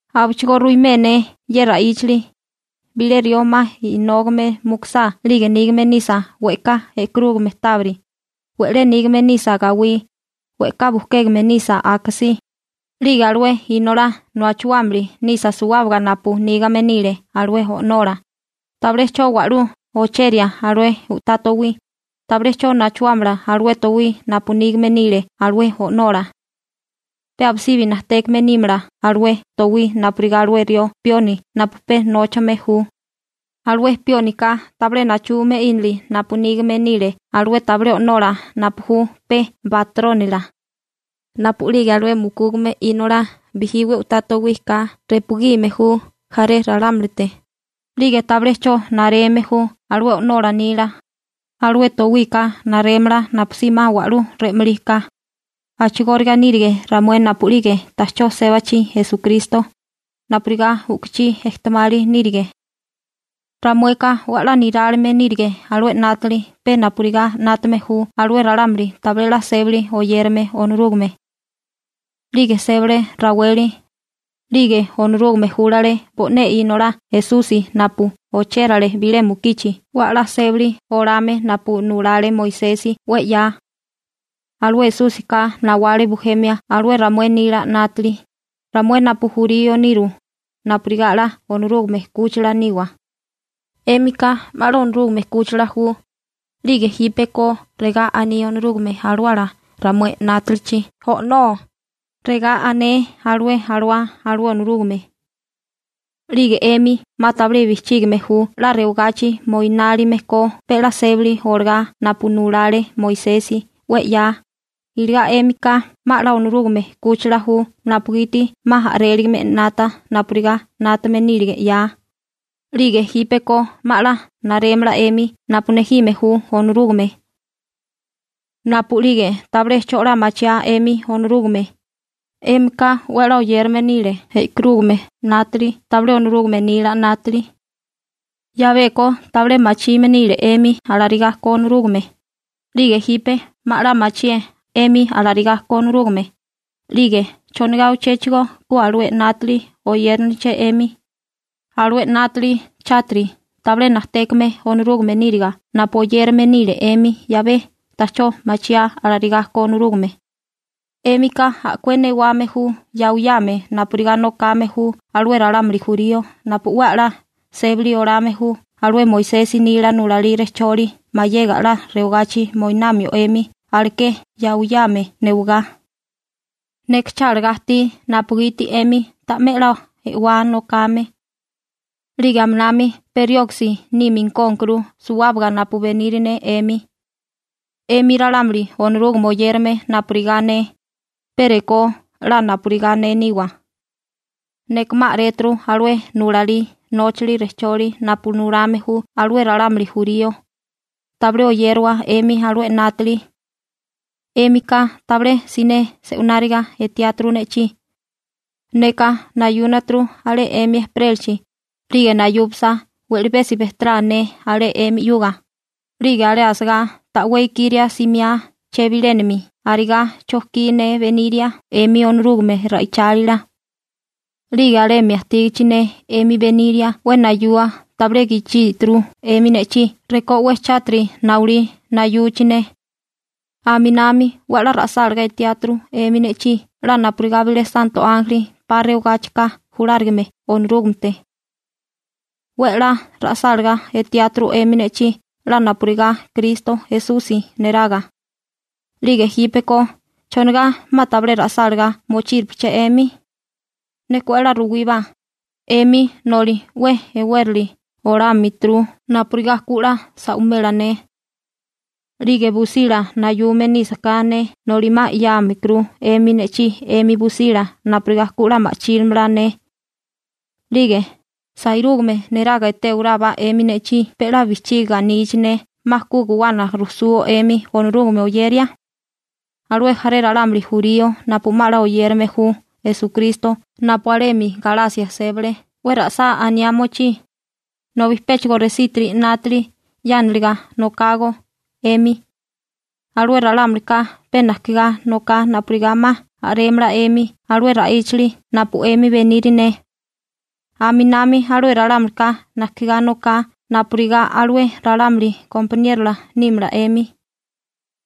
Abichigó ruimé ne ye ra'íchili: Bilé rió 'ma inógame mukusá 'lige nígame nisa we'ká e'karúgame tábiri, we'lé nígame nisa gawí, we'ká bujkégame nisa akasí, 'lige alué inolá nachuámili nisa suwábaga napu nígame nile alué o'nola, tabilé 'cho wa'lú ocheria alué u'tá towí, tabilé 'cho nachuámala alué towí napu nígame nile alué o'nola. Pe abisibi najtékame nímala alué towí napurigá alué rió pioni napu pe nóchame ju. Alué piónika tabilé nachume 'ínili napu nígame nile alué tabilé o'nola napu ju pe batrónila. Napu'lige alué mukúgame inolá bijí 'we u'tá towí ka repugime ju jaré ralámulite, 'lige tabilé 'cho nareme ju alué o'nola nila, alué towika narémala napusí 'ma wa'lú re'malí ka. A'chigóriga nírige ramué napu'lige ta'chó sébachi Esukristo, napurigá u'kuchí ejtemali nírige. Ramueka 'we 'la nirálime nírige alué 'nátili pe napurigá 'nátame ju alué ralámuli tabilé 'la sébali oyérame Onorúgame. 'Lige sébale raweli, 'lige Onorúgame júlale bo'né Inolá Esusi napu ochérale bilé mukichi 'we 'la sébali olame napu nulale Moisesi 'we 'ya. Alué Esúsika nawale bujemia alué ramué nila 'nátili, ramué napu jurío niru, napurigá 'la Onorúgame 'kúchila niwa. 'Émika 'ma 'la Onorúgame 'kúchila ju, 'lige jípeko regá aní Onorúgame Alawala ramué 'nátalichi: «O'nó», regá ané alué alawá alué Onorúgame. 'Lige 'émi 'ma tabilé bijchígime ju 'la rewagachi moinálime ko pe 'la sébali olagá napu nulale Moisesi 'we 'ya, iligá 'émika 'ma 'la Onorúgame 'kúchila ju napugiti 'ma a'réligame 'nata napurigá 'nátame nílige 'ya, 'lige jípeko 'ma 'la narémala 'emi napu nejime ju Onorúgame. Napu'lige tabilé 'cho 'la machiáa 'emi Onorúgame, 'émika 'we 'la oyérame nile e'karúgame 'nátili tabilé Onorúgame nila 'nátili. 'Yabeko tabilé machime nile 'emi alarigá ko Onorúgame, 'lige jipe 'ma 'la machié 'emi alarigá ko Onorúgame, 'lige ¿chonigá uchéchigo ku alué 'nátili oyériniliché 'emi, alué 'nátili chátiri tabilé najtékame Onorúgame níriga napu oyérame nile 'emi 'yabé ta'chó machiáa alarigá ko Onorúgame? 'Émika a'kué newame ju yawiyame napurigá nokame ju alué ralámuli jurío napu 'we 'la sébali olame ju alué Moisesi nila nulalí rejcholi mayega 'la rewagachi moinamio 'emi aleké yawiyame newagá. Neka chálagá ajtí napugiti 'emi ta'mé 'la e'wá nokame. 'Lige aminami pe rioksi nímikónkuru suwábaga napu beniri ne 'emi. 'Emi ralámuli Onorúgame oyérame napurigá ne, pe rekó 'la napurigá ne niwa. Neka 'ma a'réturu alué nulalí nóchali rejcholi napu nulame ju alué ralámuli jurío. Tabilé oyérawa 'emi alué 'nátili. 'Émika tabilé siné se'wináriga etiáturu ne'chí. Neka nayúnaturu alé 'emi ejperélachi, 'lige nayupasa we'libesi bejterá ne alé 'emi 'yuga, 'lige alé asagá ta'wé ikiria simiá chebilénami arigá chojkí ne beniria 'emi Onorúgame ra'ichálila. 'Lige alemi ajtígichi ne 'emi beniria 'we nayua tabilé gichíturu 'emi ne'chí rekó 'we chátiri nawilí nayuchi ne. Aminami 'we 'la ra'sálagá etiáturu 'emi ne'chí 'la napurigá bilé santo ánjeli 'pa rewagáchika julárigame Onorúgamete. 'We 'la ra'sálagá etiáturu 'emi ne'chí 'la napurigá Kristo Esusi neraga. 'Lige jípeko, ¿chonigá 'ma tabilé ra'sálagá mochíripeché 'emi? Neka 'we 'la ruwíbá, 'emi noli 'we e'wérali olámituru napurigá ku 'la sa'wimela ne. 'Lige busila nayume nísaká ne noli 'ma 'yámikuru 'emi ne'chí 'emi busila napurigá ku 'la ma'chílamala ne. 'Lige ¿sairúgame neraga etéwarábá 'emi ne'chí pe 'la bijchiga anichi ne 'ma ku guwana rujsuo 'emi Onorúgame oyeria? Alué jaré ralámuli jurío napu 'ma 'la oyérame ju Esukristo napu alemi Galasia sébale 'we ra'sá aniá mochí, nobi péchigo resítiri 'nátili 'yániliga nokágó 'emi. Alué ralámulika pe najkigá noká napurigá 'ma a'rémala 'emi alué ra'íchali napu 'emi beniri ne. Aminami alué ralámulika najkigá noká napurigá alué ralámuli gompaniérola nímala 'emi.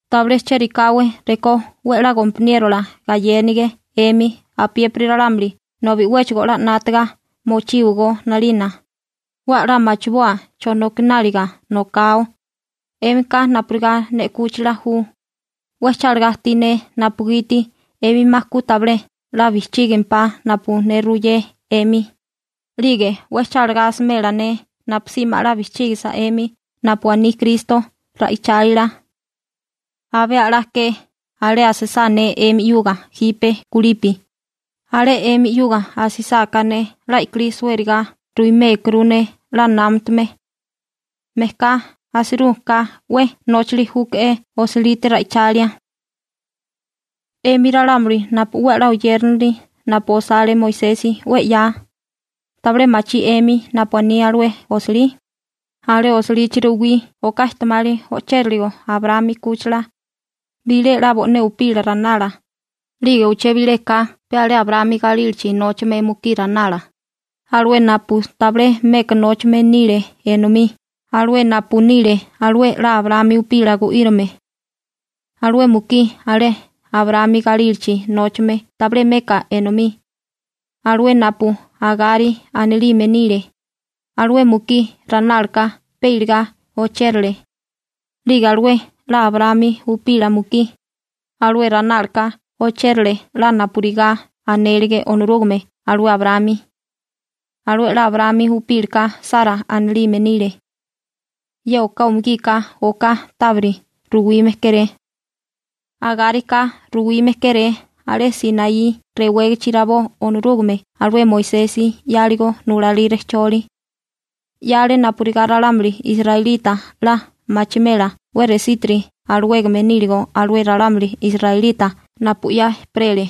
Tabilé chérikáwé rekó 'we 'la gompaniérola gayénige 'emi apiépiri ralámuli nobi 'wéchigo 'la 'nátaga mochíwagó 'nalina, 'we 'la machiboa chonokináliga nokao. 'Émika napurigá ne 'kúchila ju, 'we chalagá ajtí ne napugiti 'emi 'ma ku tabilé 'la bijchígempá napu ne ruyé 'emi, 'lige 'we chálagá asimela ne napusí 'ma 'la bijchígisa 'emi napu aní Kristo ra'ichálila. Abé a'lá ke alé asisá ne 'emi 'yuga jipe kulipi, alé 'emi 'yuga asisáká ne 'la i'kilí suériga ruwimékuru ne 'la námatame. Mejká asirú ka 'we nóchili júke'é osilite ra'ichalia. 'Emi ralámuli napu 'we 'la oyérinili napu osale Moisesi 'we 'ya, ¿tabilé machí 'emi napu aní alué osilí? Alé osilichi ruwí oká ejtemali o'chériligo Abraámi 'kúchila. Bilé 'la bo'né upila ranala, 'lige uché bileka pe alé Abraámi galílachi nóchame mukí ranala, alué napu tabilé meka nóchame nile enomí, alué napu nile alué 'la Abraámi upila gu'írame. Alué mukí alé Abraámi galílachi nóchame tabilé meka enomí, alué napu Agari anilime nile, alué mukí ranálaka pe iligá ochérale, 'lige alué 'la Abraámi upila mukí, alué ranálaka ochérale 'la napurigá anélege Onorúgame alué Abraámi. Alué 'la Abraámi upílaka Sara anilime nile. Ye oká umugika oká tábiri ruwime kéré. Agárika ruwime kéré alé Sinaí rewégachi rabó Onorúgame alué Moisesi 'yáligo nulalí rejcholi. 'Yale napurigá ralámuli israelita 'la machimela 'we resítiri alawégame níligo alué ralámuli israelita napu 'ya ejperele,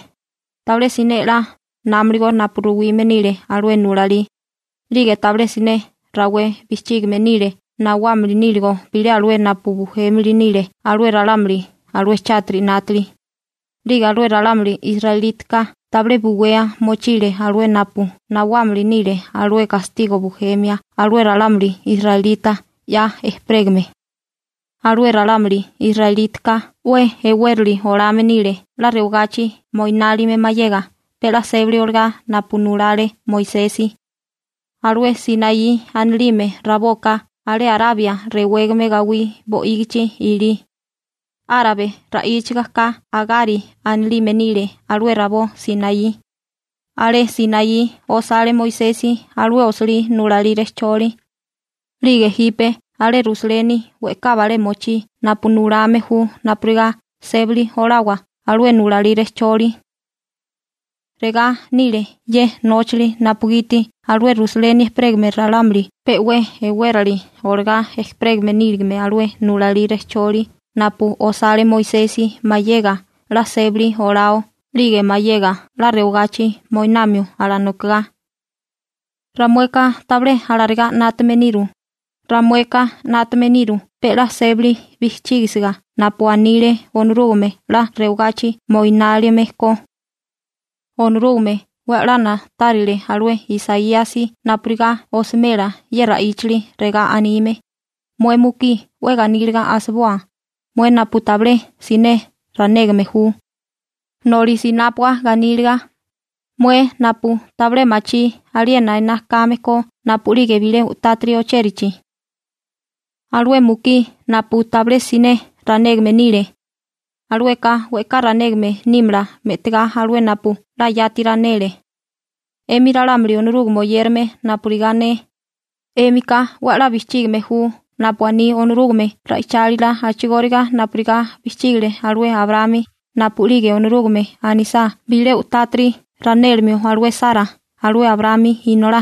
tabilé siné 'la námaligo napu ruwime nile alué nulalí, 'lige tabilé siné rawé bijchígime nile nawámili níligo bilé alué napu bujémili nile alué ralámuli alué chátiri 'nátili, 'lige alué ralámuli israelítaka tabilé buwea mochile alué napu nawámili nile alué gastigo bujemia alué ralámuli israelita 'ya ejperégame. Alué ralámuli israelítaka 'we e'wérali olame nile 'la rewagachi moinálime mayega pe 'la sébali olagá napu nulale Moisesi. Alué Sinaí anilime raboka alé Arabia rewégame gawí bo'ígichi ilí. Árabe ra'íchaga ka Agari anilime nile alué rabó Sinaí. Alé Sinaí osale Moisesi alué osilí nulalí rejcholi. 'Lige jipe alé Rusaleni we'ká balé mochí napu nulame ju napurigá sébali olawa alué nulalí rejcholi. Regá nile ye nóchali napugiti alué Rusaleni ejperégame ralámuli pe 'we e'wérali olagá ejperégame níligame alué nulalí rejcholi napu osale Moisesi mayega 'la sébali olao 'lige mayega 'la rewagachi moinamio alanokigá. Ramueka tabilé alarigá 'nátame niru, ramueka 'nátame niru pe 'la sébali bijchígisiga napu anile Onorúgame 'la rewagachi moinálime ko. Onorúgame 'we 'la na'tárile alué Isaíasi napurigá osimela ye ra'íchali regá anime: Mué mukí 'we ganíliga asiboa, mué napu tabilé siné ranégame ju. Noli sinápua ganíliga, mué napu tabilé machí aliena ená kame ko napu'lige bilé u'tátiri ochérachi. Alué mukí napu tabilé siné ranégame nile, alueka we'ká ranégame nímala me'tigá alué napu 'la yati ranele. 'Emi ralámuli Onorúgame oyérame napurigá ne, 'émika 'we 'la bijchígime ju napu aní Onorúgame ra'ichálila a'chigóriga napurigá bijchígile alué Abraámi napu'lige Onorúgame anisá bilé u'tátiri ranélimio alué Sara alué Abraámi inolá.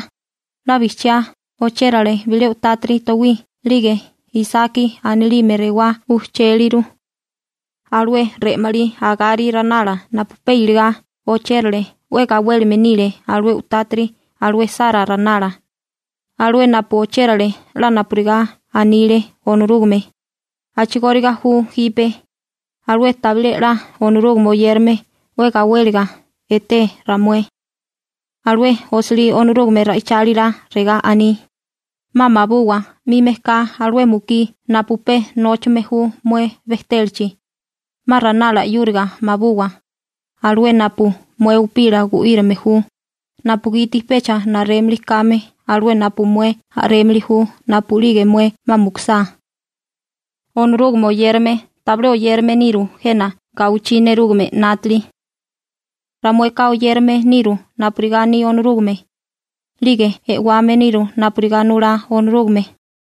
'La bijchiá ochérale bilé u'tátiri towí 'lige Isaki anilime rewá ujchéliru. Alué re'malí Agari ranala napu pe iligá ochérale 'we gawélime nile alué u'tátiri alué Sara ranala, alué napu ochérale 'la napurigá anile Onorúgame. A'chigóriga ju jipe, alué tabilé 'la Onorúgame oyérame 'we gawéliga eté ramué. Alué osilí Onorúgame ra'ichálila regá aní: «'Ma mabuwa 'mi mejká alué mukí napu pe nóchame ju mué bejtélachi, 'ma ranala 'yúriga mabuwa, alué napu mué upila gu'írame ju, napugiti pecha narémili kame alué napu mué a'rémili ju napu'lige mué 'ma mukusá.» Onorúgame oyérame tabilé oyérame niru jena gawichí nerúgame 'nátili. Ramueka oyérame niru napurigá aní Onorúgame. 'Lige e'wame niru napurigá nulá Onorúgame.